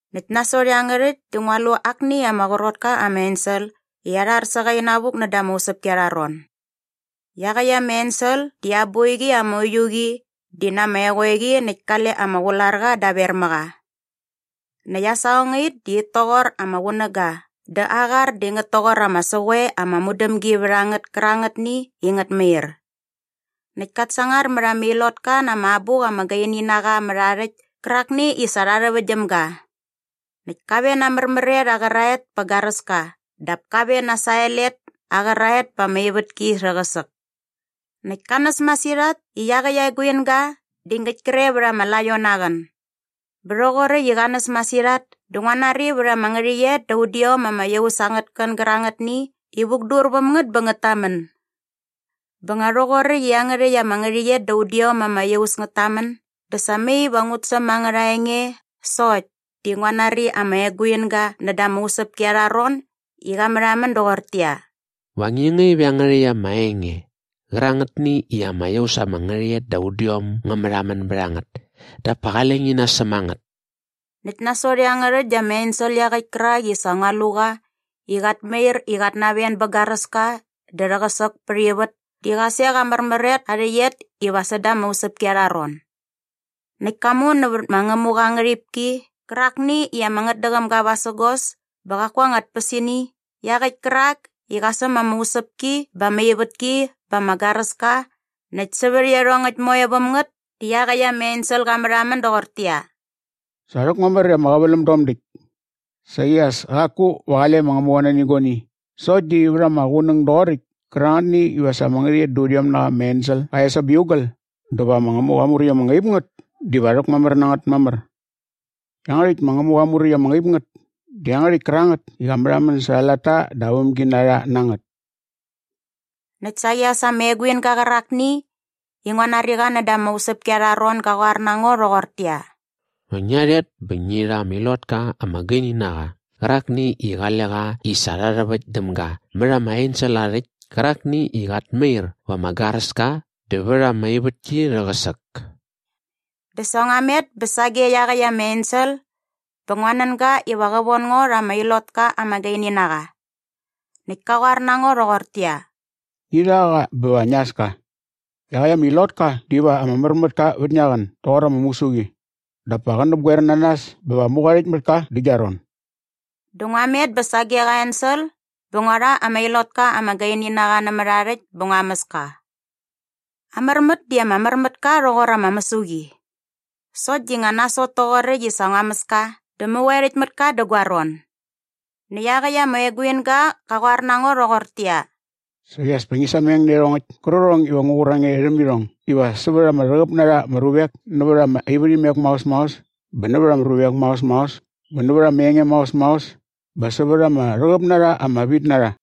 Näkt nasot iangärhäkt dä ngua lu akni ama qrot ka ama ensel i arhar sä qa inavuk näda ama usäpki arha ron. Iaqäkt ama ensel di aa boiqi ama uiu qi di na ama eqoeqi näkt kale ama qularqa daver mä qa. Näkt aa saqongait di it toqor ama qunäga dä aa qar di ngät toqor ama säqoe ama mudämgi vät a ngät kärangätni i ngät mair. Näkt kat sangar mät ama ilotka na ama abuk ama gaini na qa mät aa rhäkt kärakni i sa rha rhäväkt däm ga. Näkt ka ven na aa märmär et aa qäraet pä garäska dap ka ven na aa sael et aa qäraet pät ama ivätki rhäqäsäk näkt ka näs masirhat i iaqäkt aa eguinga di ngäkt kre vät ama laion aa qän. Bä rhoqoräkt i qa näs masirhat dä ngua nari vät ama ngärhäqyet da udiom ama iaus angät kän gärangätni i vukdur väm ngät bä ngät tamän. Bä nga rhoqoräkt i iangärhäkt ama ngärhäqyet da udiom ama iaus ngät tamän dä sa mai iva ngut säm angärha enge sokt di ngua nari ama eguinga näda ama usäpki arha ron i qa märhamän doqortäqyia, “Va ngi ngaip iangärhäkt ama enge qärangätni i ama iaus ama ngärhäqyet da udiom ngä märhamän bät a ngät dap pa qale ngi nasäm a ngät.” Näkt nasot iangärhäkt dä ama ensel iaqäkt kärak i sa ngua lu qa i qat mair i qat naven bä garäska dä rhäqäsäk pät ivät di qa sek aa märmär et aa rhäqyet iva säda ama usäpki arha ron. Näkt ka mu nävät ma Ngämuqa aa ngärhipki qärakni i ama ngätdäqäm ga vasägos bä qaku aa anga tpäsini iaqäkt kärak i qa säm ama usäpki bä ama ivätki bä ama garäska näkt sävät iarhongäkt moe väm ngät di iaqäkt ama ensel qa märhamän doqortäqyia, “Sa rhäkmamär i ama qäväläm dom däkt. Saqi as kaku va qale ma Ngämuqa nani guani sokt di vät ama qunäng doqoräkt kärangätni iva sa ama ngärhäqyet da udiom na qa ama ensel qa es aa biugal dä va ma Ngämuqa aa muräkt ama ngaip ngät diva rhäkmamär na ngät mamär. Iangärhäkt ma Ngämuqa aa muräkt ama ngaip ngät di iangärhäkt kärangät i qa märhamän särha aa latta dä aa vämginarha na ngät.” Näkt saqi as ama eguinga qärakni i ngua nari qa näda ama usäpki arha ron ga qoar na ngo rhoqortäqyia, “Va ngia rhet bä ngi rha ama ilotka ama gaini na qa qärakni i qale qa i sa rha rhäväkt däm ga mät ama ensel aa rhäkt kärakni i qat mair va ama garäska dä vät ama ivätki rhäqäsäk.” Dä sa ngua met bä sage iaqäkt ama ensel bä ngua nän ga iva qä von ngo rha ama ilotka ama gaini na qa. Näkt ka qoar na ngo rhoqortäqyia, “Ngi rha qa bä va ngia äs ka. Iaqäkt ama ilotka diva ama mär mät ka vät ngia qän doqor ama mäsuqi dap pa qä näpgoer na nas bä va mäqoerhäkt mät ka dä gia ron.” Dä ngua met bä sage qa ensel bä ngua rha ama ilotka ama gaini na qa nämät aa rhäkt bä ngua mäs ka. Aa märmät di ama mär mät ka rhoqor ama mäsuqi. Sokt di ngä nasot toqoräkt i sa ngua mäs ka dä mäqoerhäkt mät ka dä gua ron. Näkt iaqäkt ama eguinga qa qoar na ngo rhoqortäqyia, “Saqi as pa ngi sameng nä iarhongäkt kärqärhong iva ngu qur a nge rhäm irhong iva sävät ama rhäqäp na rha ama ruvek nävät ama ivärhimek maos maos bä nävät ama ruvek maos maos bä nävät ama enge maos maos bä sävät ama rhäqäp na rha ama vitnarha.”